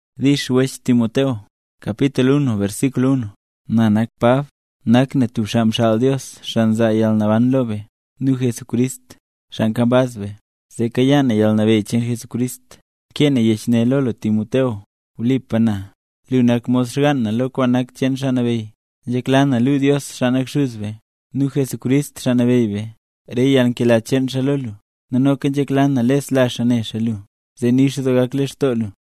Dix Wech Timoteo. Na nak Pab. Nak na tub xaa mxaal Dios, xaa nzaa yalnaban lo be, nu Jesucrist, xaa nkambaz be, zee kayaa na yalnabeyy cheen Jesucrist. Nkee na yech ne lo lu Timoteo. Wlipa na, lu nak mod xgaan na lo kwaan nak cheen Xaa Nabeyy. Nzhekla na luu Dios, xaa nak Xuz be, nu Jesucrist, Xaa Nabeyy be, re yalnkela cheen xaa lo lu, nu noka nzhekla na lesla xaa ne xaa lu, zee nix doo gak lextoo lu.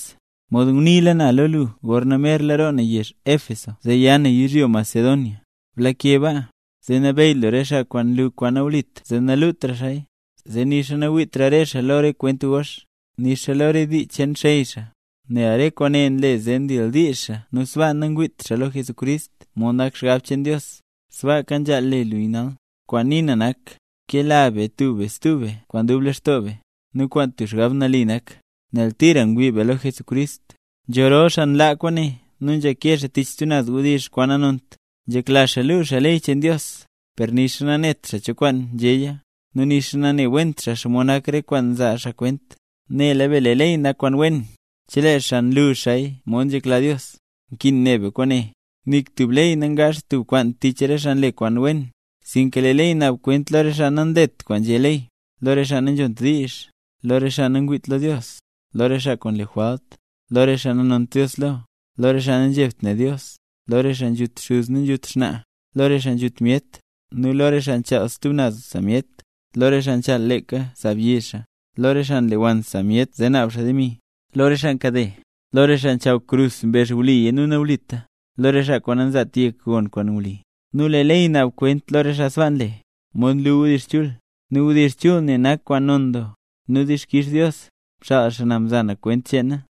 Mod nguniila na lo lu gorna merla roo na yezh Éfeso zee ya na yizhyo Macedonia, blake baa, zee nabeyy lu re xaa kwaan nlu kwaan nawlit zee nalutra xaaya, zee nixa nawiitra re xaa lo re kwent gox, nixa lo re dii cheen xey xaa. Nel re kwaane nle zee ndildiizh xaa nu sbaa nangwiit xaa lo Jesucrist mod nak xgab cheen Dios. Sbaaka nzhaal le lu nal. Kwaan nii na nak: Kela be tub be stub be kwaan dub lextoo be, nu kwaan tub xgab nali nak, nel tira ngwii be lo Jesucrist. Nzho rol xaa nlaa kwaane nu nzhake xaa tich stub naz wdizh kwaan nanont. Nzhekla xaa luu xaa ley cheen Dios, per nixa nanet xaa cho kwaan nzhéya, nu nixa nanewent xaa xomod nak re kwaan nzaa xaa kwent. Nela be lee ley nak kwaan wen, chelee xaa nlu xaaya mod nzhekla Dios. Nkin ne be kwaane, nik tub ley nangaazht tub kwaan tich re xaa nle kwaan wen, sinka lee ley naab kwent: lo re xaa nanlet kwaan nzhé ley, lo re xaa nanzhont diizh, lo re xaa nangwiit lo Dios, lo re xaa kwaan nle jwalt, lo re xaa nanont Dios lo, lo re xaa nanzhebt ne Dios, lo re xaa nzhut xuz nu nzhut xnaa, lo re xaa nzhut myet, nu lo re xaa nchaal stub naz sa myet, lo re xaa nchaal leeka sa byi xaa, lo re xaa nlewann sa myet zee naab xaa demi, lo re xaa nkade, lo re xaa nchaw krus mbezh wliya nu nawlita, lo re xaa kwaan nanzaat yek gon kwaan wli. Nu lee ley naab kwent lo re xaa sbaa nle, mod nlu wdizh chul. Nu wdizh chul ne nak kwaan non doo, nu dixkix Dios, mxaal xaa na mza na kwent cheena.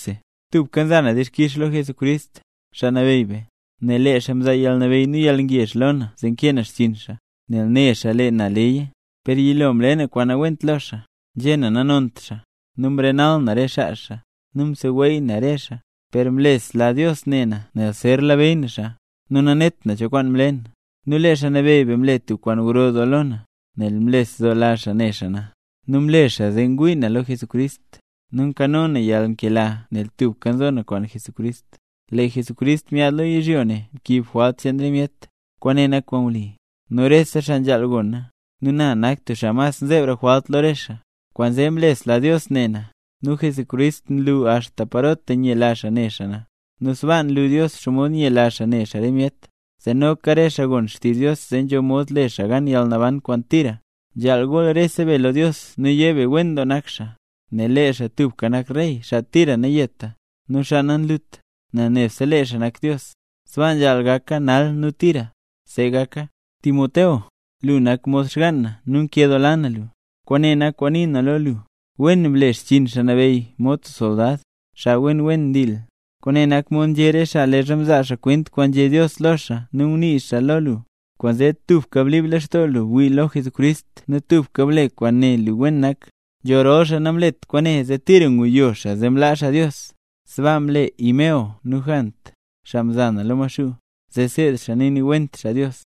Tubka nza na dixkix lo Jesucrist, Xaa Nabeyy be, nel lee xaa mzaa yalnabeyy nu yalngezh lo na zee nkee na xchiin xaa, nel ne xaa lee na leya. Per yilo mle na kwaan nawent lo xaa: nzhé na nanont xaa, nu mrenal na re xaa xaa, nu mseweey na re xaa. Per mlesla Dios ne na nel zer labeyy na xaa, nu nanet na cho kwaan mle na. Nu lee Xaa Nabeyy be mle tub kwaan gro doo lo na, nel mlesdoola xaa ne xaa na, nu mle xaa zee ngwii na lo Jesucrist, nu nkano na yalnkela nel tubka nzo na kwaan Jesucrist. “Lee Jesucrist myaad lo yizhyo ne mkiib jwalt cheen re myet.” Kwaane nak kwaan wli, nu rese xaa nzhaal gona. Nu na nak tub xaa mas mzebra jwalt lo re xaa. Kwaanzee mlesla Dios ne na, nu Jesucrist nlu axta parota nyela xaa ne xaa na, nu sbaa nlu Dios xomod nyela xaa ne xaa re myet, zee noka re xaa gon xtizh Dios zee nzho mod le xaa gan yalnaban kwaan tira. Nzhaal gool rese be lo Dios nu yé be wen doo nak xaa, nel lee xaa tubka nak rey, xaa tira nayeta, nu xaa nanlut, nel nebse lee xaa nak Dios. Sbaa nzhaal gaka nal nu tira. ¡See gaka! Timoteo, lu nak mod xgaan na nu nkedoola na lu. Kwaane nak kwaan nii na lo lu, wen ble xchiin Xaa Nabeyy mod soldad, xaa wen ndil. Kwaane nak mod nzhé re xaa leezha mzaa xaa kwent kwaan nzhé Dios lo xaa nu ngunii xaaya lo lu. Kwaanzee tubka blib lextoo lu wii lo Jesucrist nu tubka ble kwaan ne lu wen nak. Nzho rol xaa namlet kwaane zee tira nguyo xaa zee mlaa xaa Dios. Sbaa mle Himeneo nu Jant, xaa mza na lo Maxuu, zee seed xaa naniiwent xaa Dios.